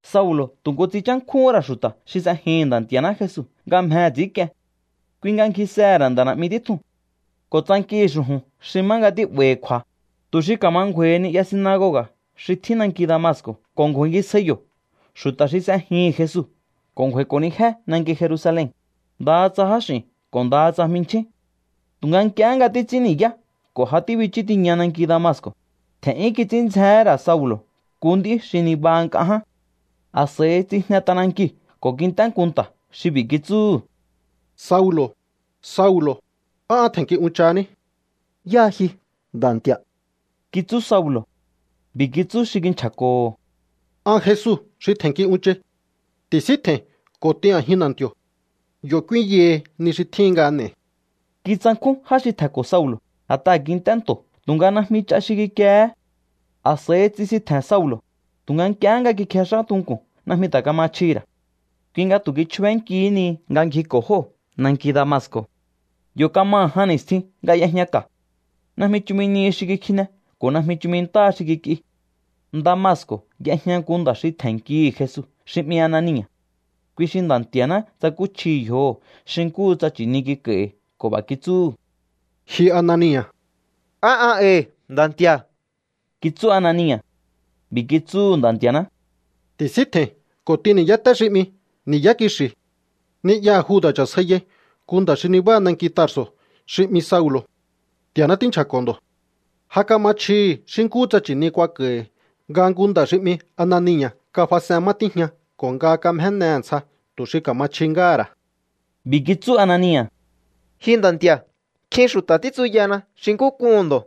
Saulo̱ tu̱ nku tsinchánkjúhún ra̱ xu̱ta̱ xi s'ejihi̱n Nda̱ Nti̱a̱ná Jesu nga mjehe̱ ts'i̱ínk'ien. Kui nga ngjisehe̱ ra̱ nda̱ na̱'mi títjuu̱n ko̱ tsankihi̱ xu̱ju̱n xi má nga tí'ba̱i̱hi̱ kju̱a̱, tu̱ xi ka̱ma ngju̱a̱i̱hi ni'ya sinagoga̱ xi tjín nanki Damasco̱ ko̱ ku̱a̱ngisjai yo̱ xu̱ta̱ xi s'ejihi̱n Jesu ko̱ kj'u̱a̱íko̱nijé nanki Jerusalen, ndaha tsa jáx'i̱n ko̱ ndaha tsa jminchjín. Tu̱nga nk'iehé nga títs'ín ni̱yá ko̱ ja tíbichú tiña nanki Damasco̱, tje̱n'yún kits'ín ndzjehé ra̱ Saulo̱ nku nd'í xi nibaha nk'a ján. A̱s'a̱i tsijne t'anankiu̱ ko̱ kint'é nku nta̱ xi b'i̱ kitsúhu̱: —Saulo̱, Saulo̱, ¿á an tje̱nnki unchahaní? —¿Yáha ji, Nda̱ Nti̱a̱? —kitsú Saulo̱. B'i̱ kitsú xi kinchja̱ko̱ho̱: —An Jesu xi tje̱nnki unchai. Ti̱síntje̱i̱n ko̱ t'in a̱jin na̱nti̱o̱. Yo̱ k'úínyahi ni xi tjíhin nga n'e̱i̱. Kitsankjún já xi tje̱nko̱ Saulo̱, a̱t'aha̱ kint'é nto̱ tu̱nga najmi ch'a xi kikiehé. A̱s'a̱i tsisintje̱n Saulo̱, tu̱nga nk'ie nga kikjex'á tunku̱n najmi ta̱ kama chjihi̱ ra̱. Kui nga tu̱ kichjubénkihí ni nga ngjiko̱ jóo̱ nanki Damasco̱. Yo̱ kamaha̱ jan ni̱stjin nga y'ejña ka̱. Najmi chumi nihi xi kikjine ko̱ najmi chumi ntáha xi kik'i. Damasco̱ y'ejña nku nda̱ xi tje̱nnkihi̱ Jesu xi 'mi Anania̱. Kui xi Nda̱ Nti̱a̱ná tsakúchjihi̱ yjoho̱ xi nkúhu tsa nchi̱ni kik'a̱i̱hi̱ ko̱ b'a̱ kitsúhu̱: —¡Ji Anania̱! —Á an e̱i̱, Nda̱ Nti̱a̱ —kitsú Anania̱. B'i̱ kitsúhu̱ Nda̱ Nti̱a̱ná: —Ti̱síntje̱i̱n ko̱ t'in ni̱yáté xi 'mi Ni̱yá Kixi̱. Ni'yaha̱ Juda̱ cha̱sjaiyai nku nda̱ xi nibáha nanki Tarso̱ xi 'mi Saulo̱. Nti̱a̱ná tínchja̱ko̱ ndo̱. Ja kama chjihi̱ xi nkúhu tsa nchi̱ni kuak'a̱i̱hi̱ nga nku nda̱ xi 'mi Anania̱ kafas'en má tíjña ko̱ nga kamjénehe̱ ntsja tu̱ xi ka̱ma chji ngáha̱ ra̱. B'i̱ kitsú Anania̱: —Ji Nda̱ Nti̱a̱, nkjin xu̱ta̱ títsuyana xi nkú k'uhu̱n ndo̱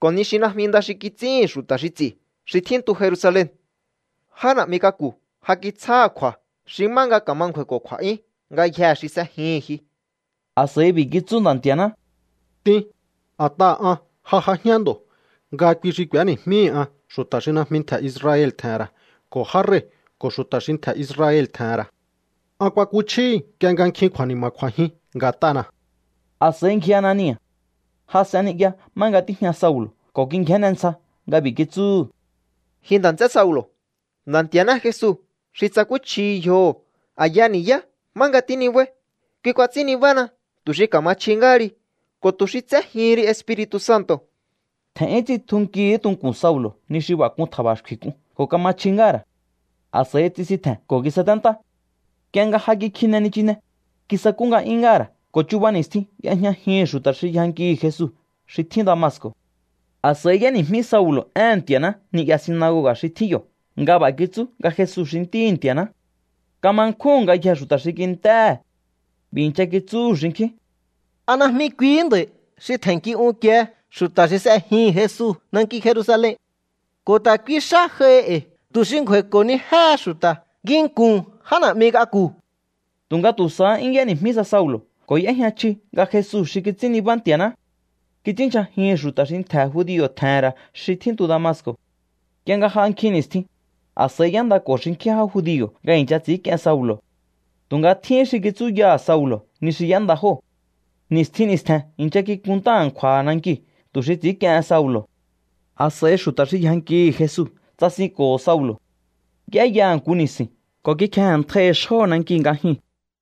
ko̱ ni xi najmi nda xi kits'íhi̱n xu̱ta̱ xi ts'i̱ xi tjíntu Jerusalen. Já na̱'mi k'aku̱ ja kitsjáha̱ kju̱a̱ xi má nga ka̱ma ngju̱a̱i̱ko̱ kju̱a̱'yún ngayjee̱ xi s'ejihi̱n ji. A̱s'a̱i b'i̱ kitsú Nda̱ Nti̱a̱ná: —T'in, a̱t'aha̱ an ja j'ajián ndo̱ nga kui xi k'u̱éni̱jmíhi̱ an xu̱ta̱ xi najmi ntje̱ Israel tje̱he̱n ra̱ ko̱ já rei̱ ko̱ xu̱ta̱ xi ntje̱ Israel tje̱he̱n ra̱. An kuakuchjíhi̱ nk'ie nga nkjin kju̱a̱ni̱ma̱ kj'u̱a̱jin nga̱t'ana̱. A̱s'a̱i ngji Anania̱. Jas'en ni'ya má nga tíjña Saulo̱ ko̱ kingjénne ntsja nga b'i̱ kitsúhu̱: —Ji nda̱ nts'é Saulo̱, Nda̱ Nti̱a̱ná Jesu xi tsakúchjihi yjoho̱ a̱ya ni̱yá má nga tínibáí, kui kuats'ín nibána tu̱ xi ka̱ma chji ngáha ri ko̱ tu̱ xi tséjihin ri Espiri̱tu̱ Santo̱. Tje̱n'yún tsitjunkihí tunku̱n Saulo̱ ni xi b'a̱ k'un tja̱ba̱xkfi̱ k'un ko̱ kama chji ngáha̱ ra̱. A̱s'a̱i tsisintje̱n ko̱ kisaténtá. Nk'ie nga ja kikjine nichine, kisakú nga'yún ngáha̱ ra̱ ko̱ chuba ni̱stjin y'ejñajihi̱n xu̱ta̱ xi yjankihi̱ Jesu xi tjín Damasco̱. A̱s'a̱i y'éni̱jmí Saulo̱ éhe̱n Nti̱a̱ná ni'ya sinagoga̱ xi tjín yo̱ nga b'a̱ kitsú nga Jesu xi Ntíhi̱ Nti̱a̱ná. Kama nkjúhu̱n ngayjee̱ xu̱ta̱ xi kint'éhe̱. B'i̱ i̱ncha kitsúhu̱ xinkjín: —¿A najmi kuihí nda̱i̱ xi tje̱nnki unkie xu̱ta̱ xi s'ejihi̱n Jesu nanki Jerusalen? Ko̱ ta̱ kui xá j'aihi e̱i̱ tu̱ xi ngju̱a̱i̱ko̱nijéhe xu̱ta̱ nginku̱n já na̱'mi k'aku̱. Tu̱nga tu̱ sahá 'yún y'éni̱jmí sa Saulo̱ ko̱ y'éjña chji nga Jesu xi kits'ín nibá Nti̱a̱ná. Kits'ínndyja̱jihi̱n xu̱ta̱ xi ntje̱ judio̱ tje̱he̱n ra̱ xi tjíntu Damasco̱. Nk'ie nga j'a nkjin ni̱stjin, a̱s'a̱i y'éndako̱ xinkjín já judio̱ nga i̱ncha ts'i̱ínk'ien Saulo̱. Tu̱nga tjíhín xi kitsúyaha̱ Saulo̱ ni xi y'énda jóo̱. Ni̱stjin ni̱stje̱n i̱ncha kikunntá a̱nkju̱a̱ha̱ nankiu̱ tu̱ xi ts'i̱ínk'iehen Saulo̱. A̱s'a̱i xu̱ta̱ xi yjankihi̱ Jesu tsasinko̱ho̱ Saulo̱. Y'éyaha̱ nku ni̱si̱n ko̱ kikjeje̱nntjaihi̱ xjóho̱ nankiu̱ nga jyuu̱n.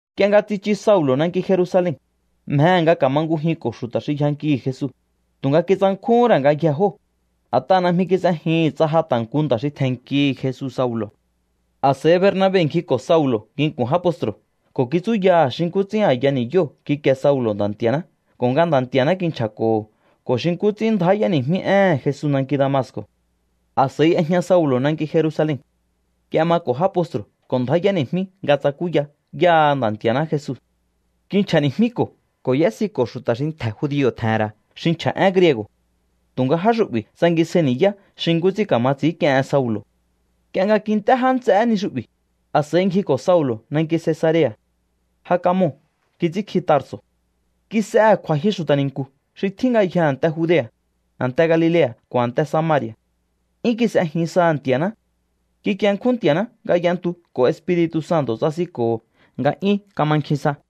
Nk'ie nga tsichu Saulo̱ nanki Jerusalen, mjehe̱ nga ka̱mangujinko̱ xu̱ta̱ xi yjankihi̱ Jesu, tu̱nga kitsankjúhún ra̱ ngayjee̱ jóo̱, a̱t'aha̱ najmi kis'ejihi̱n tsa ja ta̱ nku nda̱ xi tje̱nnkihi̱ Jesu Saulo̱. A̱s'a̱i Bernabe ngjiko̱ Saulo̱ nginku̱n já postru̱ ko̱ kitsúyaha̱ xi nkú ts'ín a̱ya ni̱yóo̱ kikie Saulo̱ Nda̱ Nti̱a̱ná ko̱ nga Nda̱ Nti̱a̱ná kinchja̱ko̱ho̱ ko̱ xi nkú ts'ín ndjá y'éni̱jmí éhe̱n Jesu nanki Damasco̱. A̱s'a̱i y'ejña Saulo̱ nanki Jerusalen. Y'emako̱ já postru̱ ko̱ ndjá y'éni̱jmí nga tsakúya yáha Nda̱ Nti̱a̱ná Jesu. Kinchja̱ni̱jmíko̱ ko̱ y'ésiko̱ xu̱ta̱ xi ntje̱ judio̱ tje̱he̱n ra̱ xi nchja̱ én griego̱. Tu̱nga já xu'bi̱ tsangisjai ni̱yá xi nkú ts'ín ka̱ma ts'i̱ínk'ien Saulo̱. Nk'ie nga kint'é já nts'eé ni xu'bi̱, a̱s'a̱i ngjiko̱ Saulo̱ nanki Cesarea̱. Ja kamoo̱ kits'ínkji Tarso̱. Kis'ehe̱ kju̱a̱jyu xu̱ta̱ ni̱nku̱ xi tjín ngayjee̱ a̱nte Judea̱, a̱nte Galilea̱ ko̱ a̱nte Samari̱a̱. 'Yún kis'ejin saha̱ Nti̱a̱ná. Kikienkjún Nti̱a̱ná nga y'entu ko̱ Espiri̱tu̱ Santo̱ tsasinko̱ho̱ nga 'yún kama nkjin sa.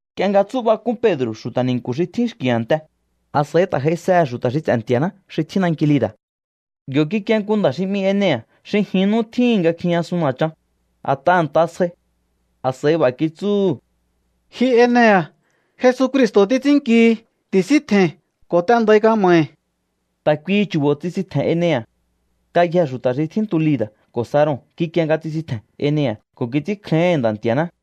Nk'ie nga tsú'bak'un Pedro̱ xu̱ta̱ ni̱nku̱ xi tjín xki̱ a̱nte, a̱s'a̱i ta̱ j'aisehe̱ xu̱ta̱ xi ts'e̱ Nti̱a̱ná xi tjín nanki Lida̱. Yo̱ kikie nku nda̱ xi 'mi Enea̱ xi jin nú tjíhi̱n nga kjijñasun na̱chan, a̱t'aha̱ nta sjai. A̱s'a̱i b'a̱ kitsúhu̱: —Ji Enea̱, Jesucristo̱ títs'ínnkihi. Ti̱síntje̱i̱n ko̱ t'endai kama̱hi̱. Ta̱ kuihi chu̱bo̱ tsisintje̱n Enea̱. Ngayjee̱ xu̱ta̱ xi tjíntu Lida̱ ko̱ Saron kikie nga tsisintje̱n Enea̱ ko̱ kits'ínkjáíhi̱n Nda̱ Nti̱a̱ná.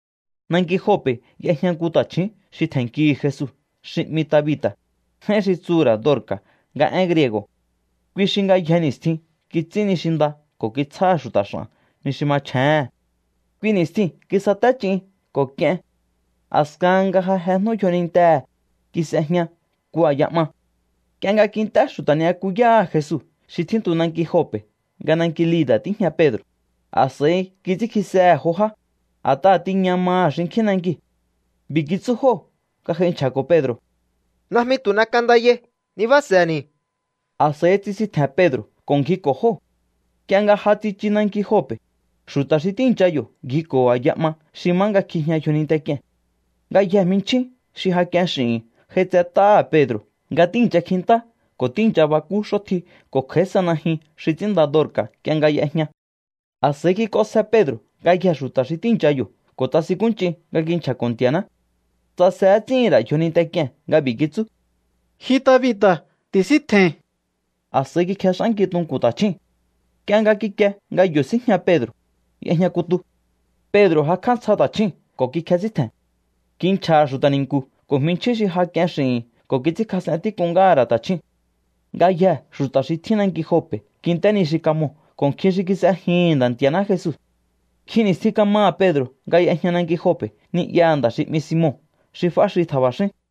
Nanki Jope̱ y'ejña nku ta̱chju̱ún xi tje̱nnkihi̱ Jesu xi 'mi Tabita̱, j'áín xi tsuhu̱ ra̱ Dorca̱ nga én griego̱. Kui xi ngayje ni̱stjin kits'ín ni xi nda ko̱ kitsjáha̱ xu̱ta̱ x'a̱n ni xi machjéhe̱n. Kui ni̱stjiu̱n kisate ch'in ko̱ k'ien. A̱skahan nga ja jejnú yjonintehe̱, kis'ejña nku a̱ya 'ma. Nk'ie nga kint'é xu̱ta̱ ni'yakuyáha̱ Jesu xi tjíntu nanki Jope̱ nga nanki Lida̱ tíjña Pedro̱, a̱s'a̱i kits'ínkjisehe̱ jo já, a̱t'aha̱ tiña maha̱ xinkjín nankiu̱. B'i̱ kitsú jóo̱ nga j'ai nchja̱ko̱ Pedro̱: —Najmi tu̱ n'ek'andayai. Nibáa̱se̱ni̱. A̱s'a̱i tsisintje̱n Pedro̱ ko̱ ngjiko̱ jóo̱. Nk'ie nga ja tsichu nanki Jope̱, xu̱ta̱ xi tíi̱ncha yo̱ ngjiko̱ho̱ a̱ya 'ma xi má nga kjijña yjoninte k'ie̱n. Ngayjee̱ jminchjín xi ja k'ien x'i̱hi̱n j'aitset'áha̱ Pedro̱ nga tíi̱ncha kjintá ko̱ tíi̱ncha bakú x'ótji ko̱ kj'a̱í sa najyun xi ts'ínnda Dorca̱ nk'ie nga y'ejña. A̱s'a̱i kik'onsje Pedro̱ ngayjee̱ xu̱ta̱ xi tíi̱ncha yo̱ ko̱ tsasinkúnch'in nga kinchja̱ko̱ Nti̱a̱ná. Tsase ts'íhi̱n ra̱ yjoninte k'ie̱n nga b'i̱ kitsú: —Ji Tabita̱, ti̱síntje̱i̱n. A̱s'a̱i kikjex'ánki tunku̱n ta̱chjúu̱n. Nk'ie nga kikie nga yo̱ síjña Pedro̱, y'ejña kutu. Pedro̱ jakj'á ntsja ta̱chjúu̱n ko̱ kikjesíntje̱n. Kinchja̱ha̱ xu̱ta̱ ni̱nku̱ ko̱ jminchjín xi ja k'ien x'i̱hi̱n ko̱ kits'ínkjas'en tík'un ngáha̱ ra̱ ta̱chjúu̱n. Ngayjee̱ xu̱ta̱ xi tjín nanki Jope̱ kint'é ni xi kamoo̱ ko̱ nkjin xi kis'ejihi̱n Nda̱ Nti̱a̱ná Jesu. Nkjin ni̱stjin kamaha̱ Pedro̱ nga y'ejña nanki Jope̱ ni'yaha̱ nda̱ xi 'mi Simon xi f'áxi tja̱ba̱xín.